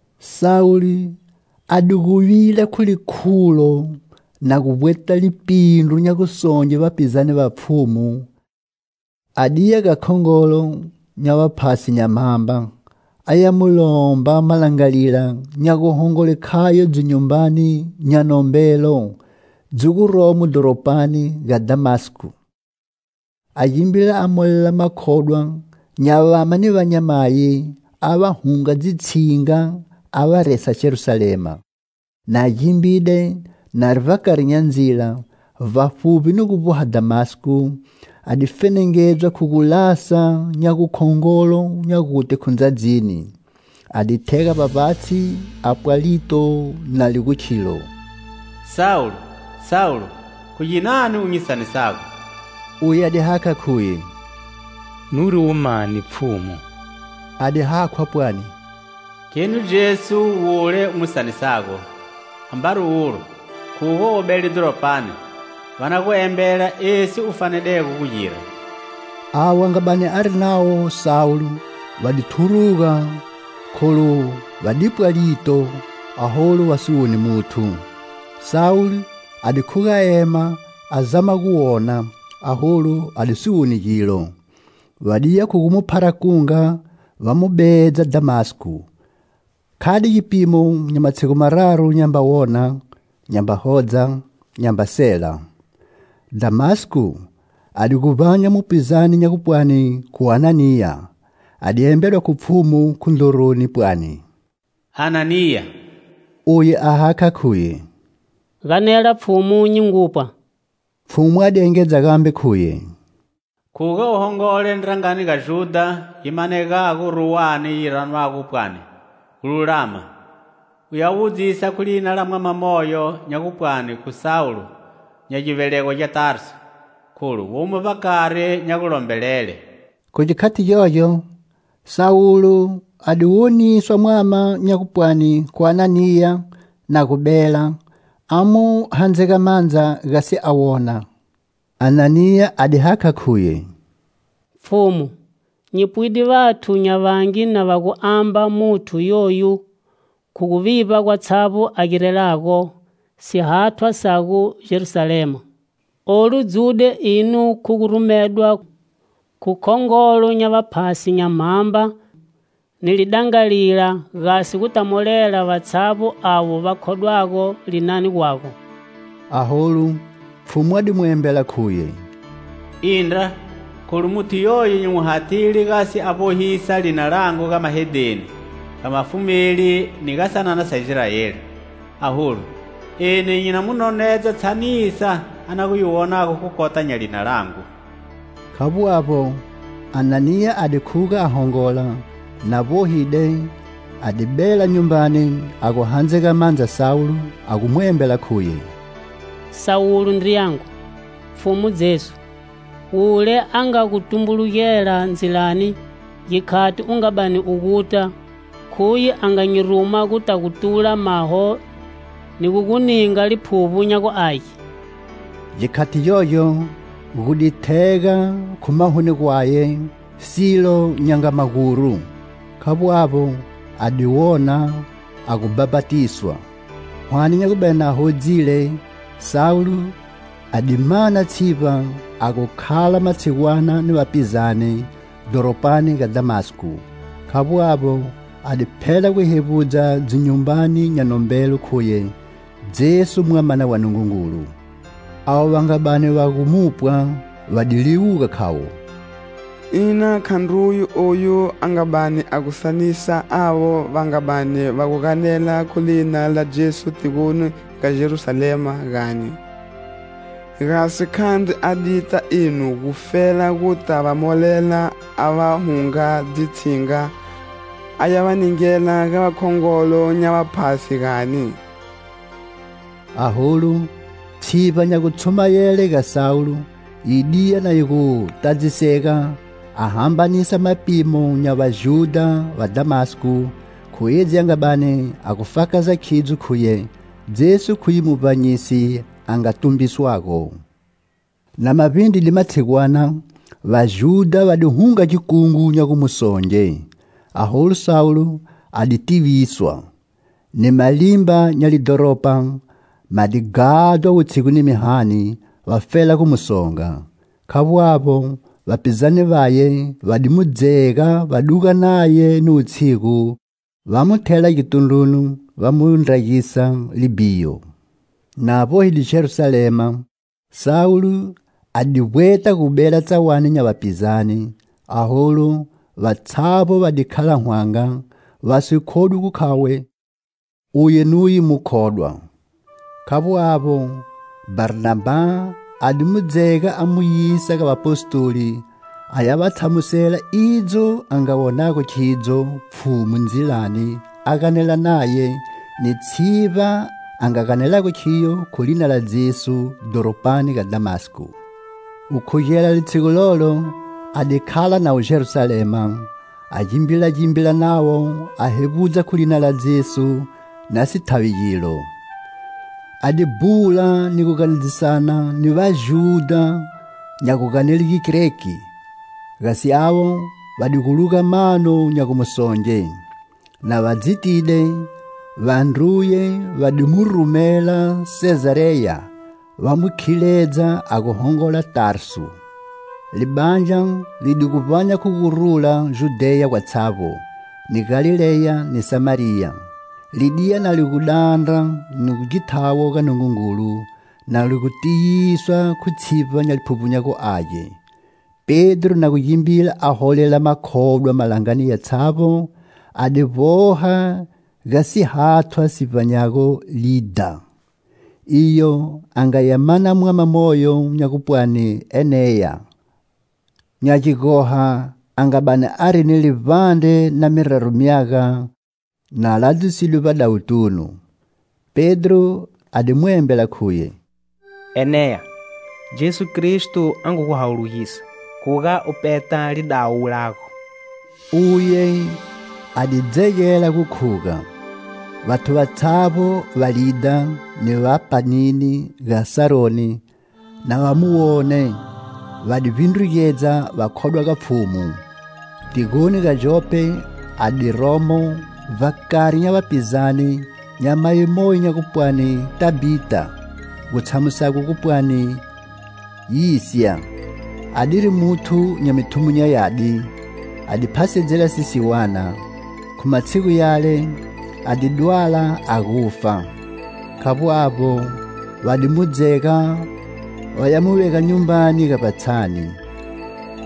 Sawulo a di gu vila khu likhulo na gu vbweta lipindru nya gu songe vapizane va Pfhumu a diya ga khongolo nya vaphasi nya mhamba, a ya mu lomba malangalila nya guhongole khayo dzinyumbani nya nombelo dzi guromo dhoropani ga Dhamasko. A gimbila a molela makhodwa nya vama ni vanyamayi a va hunga dzitshinga a va resa Jerusalema. Na gimbide, nari vbakari nya ndzila, vbafuvbi ni gu vboha Dhamasko, a di fenengedzwa khu gulasa nya gukhongolo nya gute khu ndzadzini. A di thega vbavbatshi a pwa lito na li gu khilo "Sawulo, Sawulo, khu ginani u nyi sanisago?" Uye a di hakha khuye: "Nuri uwe mani, Pfhumu?" A di hakhwa pwani: "Kheni Jesu wule u mu sanisago, ambari ulo khuga u bele dhoropani, va na gu embela esi u fanedego gu gira." Avo a nga bani ari navo Sawulo va di thuruga kholu va di pwa lito, aholu va si woni muthu. Sawulo a di khuga a ema a zama gu wona aholu a di si woni gilo. Va diya khu gu mu phara kunga va mu bedza Dhamasko. Khade gipimo nya matshigu mararu nyamba wona, nyamba hodza, nyamba sela. Dhamasko a di gu vbanya mupizane nya gupwani khu Ananiya, a di embedwa khu Pfhumu khu ndroroni, pwani: "Ananiya!" Uye a hakha khuye: "Ganela Pfhumu, nyi ngu pwa." Pfhumu a di engedza gambe khuye: "Khuga u hongola ndrangani ga Judha yi manegago ruwani yi ranwago pwani 'Gululama' u ya wudzisa khu lina la mwama moyo nya gu pwani khu Sawulo nya givelegwa gya Tarsu, kholu womo vbakari nya gulombelele." Khu gikhati gyogyo, Sawulo a di woniswa mwama nya gupwani khu Ananiya na gu bela, a mu handzega mandza gasi a wona. Ananiya a di hakha khuye: "Pfhumu, nyi pwide vathu nya vangi na va gu amba muthu yoyu khu guvivba gwatshavbo a girelago sihathwa Sago Jerusalema. Olu dzude ino khu gu rumedwa khu khongolo nya vaphasi nya mhamba ni lidangalila gasi gu ta molela vatshavbo avo va khodwago linani gwago." Aholu, Pfhumu a di mu embela khuye: "Indra, kholu muthu yoyo nyi mu hathile gasi a vbohisa Lina langu ga mahedheni, ga vafumeli ni ga sanana sa Israeli. Aholu, eni nyi na mu nonedza tshanisa a na gu yi wonago khu kota nya lina langu." Khavbo avbo, Ananiya a di khuga a hongola, na vbohile a di bela nyumbani a gu handzega mandza Sawulo a gu mu embela Khuye: "Sawulo ndriyangu, Pfhumu Jesu, wule a nga gu tumbulugela ndzilani, gikhati u nga bani u guta, khuye a nga nyi ruma guta gu tula maho ni gu gu ninga Liphuvbo nya gu Age." Gikhati gyogyo gu di thega khu mahoni gwaye silo nya nga maguru. Khavbo avbo, a di wona, a gu bhapatiswa. Hwane nya gu bani a hodzile, Sawulo a di mana tshivba a gu khala matshigwana ni vapizane, dhoropani ga Dhamasko. Khavbo avbo, a di phela gu hevbudza dzinyumbani nya nombelo khuye Jesu Mwamana wa Nungungulu. Avo va nga bani va gu mupwa va di liwuga khavo: "Ina khandruye oyu a nga bani a gu sanisa avo va nga bani va gu ganela khu Lina la Jesu tigoni ga Jerusalema, gani? Gasi khandri a dita ino gufela guta va molela a va hunga dzitshinga a ya va ningela ga vakhongolo nya vaphasi, gani?" Aholu, tshivba nya gutshumayele ga Sawulo yi diya na yi gu tadzisega, a hambanisa mapimo nya Vajudha va Dhamasko khu edzi a nga bani a gu fakaza khidzo khuye Jesu khuye Muvbanyisi a nga tumbiswago. Na ma vbindride matshigwana, Vajudha va di hunga gikungu nya gu mu songe. Aholu Sawulo a di tiviswa. Ni malimba nya lidhoropa ma di ghadhwa wutshigu ni mihani, vafela gu mu songa. Khavbo avbo, vapizane vaye va di mu dzega va duga naye ni wutshigu, va mu thela gitundruni va mu ndragisa libhiyo. Na vbohide Jerusalema, Sawulo a di vbweta gu bela tsawani nya vapizane, aholu, vatshavbo va di khala hwanga, va si khodwi gu khavo uye nuye mukhodwa. Khavbo avbo, Bharnabha a di mu dzega a mu yisa ga Vapostoli a ya va tshamusela idzo a nga wonago khidzo Pfhumu ndzilani a ganela naye, ni tshivba a nga ganelago khiyo khu lina la Jesu, dhoropani ga Dhamasko. Gukhugela litshigu lolo a di khala navo Jerusalema, a gimbilagimbila navo a hevbudza khu lina la Jesu na si thavi gilo. A di bhula ni gu ganedzisana ni Vajudha nya guganele Gigreki, gasi avo va di gu luga mano nya gu mu songe. Na va dzitide, vandruye va di mu rumela Sezareya va mu khiledza a gu hongola Tarsu. Libandla li di gu vbanya khu gu rula Judheya gwatshavbo, ni Galileya ni Samariya; Li diya na li gu dandra ni githawo ga Nungungulu, na li gu tiyiswa khu tshivba nya Liphuvbo nya gu Age. Pedro na gu gimbila a holela makhodwa malangani yatshavbo, a di vboha ga sihathwa si vbanyago Lidha. Iyo a nga ya mana mwama moyo nya gupwani Eneya, nya gigoha, a nga bani ari ni livbandre na miraru myaga na ladzisidwe vbadawutunu. Pedro a di mu embela khuye: "Eneya, Jesu Kristo a ngu gu hawulugisa; khuga u peta lidawu lago." Uye a di dzegela gu khuga. Vathu vatshavbo va Lidha ni va panini ga Saroni, na va mu wone, va di vbindrugedza va khodwa ga Pfhumu. Tigoni ga Jope a di romo, vbakari nya vapizane, nyamayi moyo nya gupwani Tabhita, gu tshamusago gu pwani "Yisya!"Adiri muthu nya mithumo nya yadi, a di phasedzela sisiwana. Khu matshigu yale, a di dwala, a gu fa. Khavbo avbo, va di mu dzega va ya mu vega nyumbani ga vbatshani.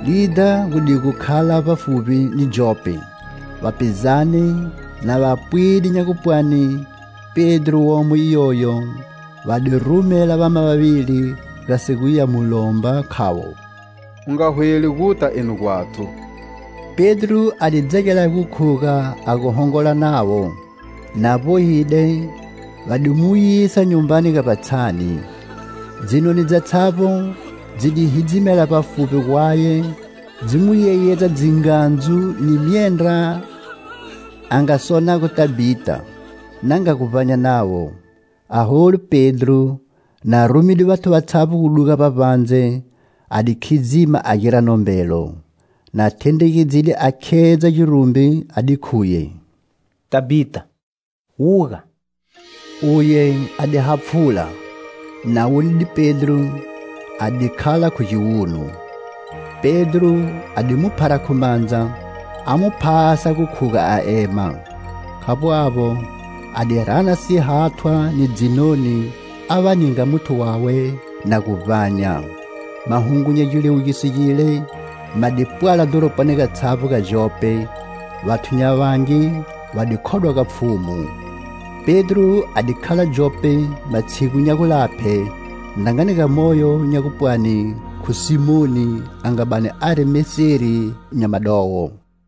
Lidha gu di gu, khala vbafuvbi ni Jope, vapizane na va pwide nya gupwani, Pedro womo iyoyo, va di rumela vama vavili gasi guya mu lomba, khavo: "U nga hweli guta eno gwathu." Pedro a di dzegela gu khuga a gu hongola navo. Na vbohide, va di mu yisa nyumbani ga vbatshani; dzinoni dzatshavbo dzi di hidzimela vbafuvbi gwaye, dzi mu yeyedza dzingandzu ni myendra a nga sonago Tabhita, na nga gu vbanya navo. Aholu, Pedro, na rumide vathu vatshavbo gu duga vbavbandze, a di khidzima a gira nombelo. Na thendregedzide a khedza girumbi, a di khuye: "Tabhita, wuga!" Uye a di hapfhula; na wonide Pedro, a di khala khu giwunu. Pedro a di mu phara khu mandza, a mu phasa gu khuga a ema. Khavbo avbo, a di rana sihathwa ni dzinoni a va ninga muthu wawe na gu vbanya. Mahungu nya giliwugiso gile ma di pwala dhoropani gatshavbo ga Jope, vathu nya vangi va di khodwa ga Pfhumu. Pedro a di khala Jope matshigu nya gulaphe, ndrangani ga moyo nya gupwani khu Simoni a nga bani ari meseri nya madowo.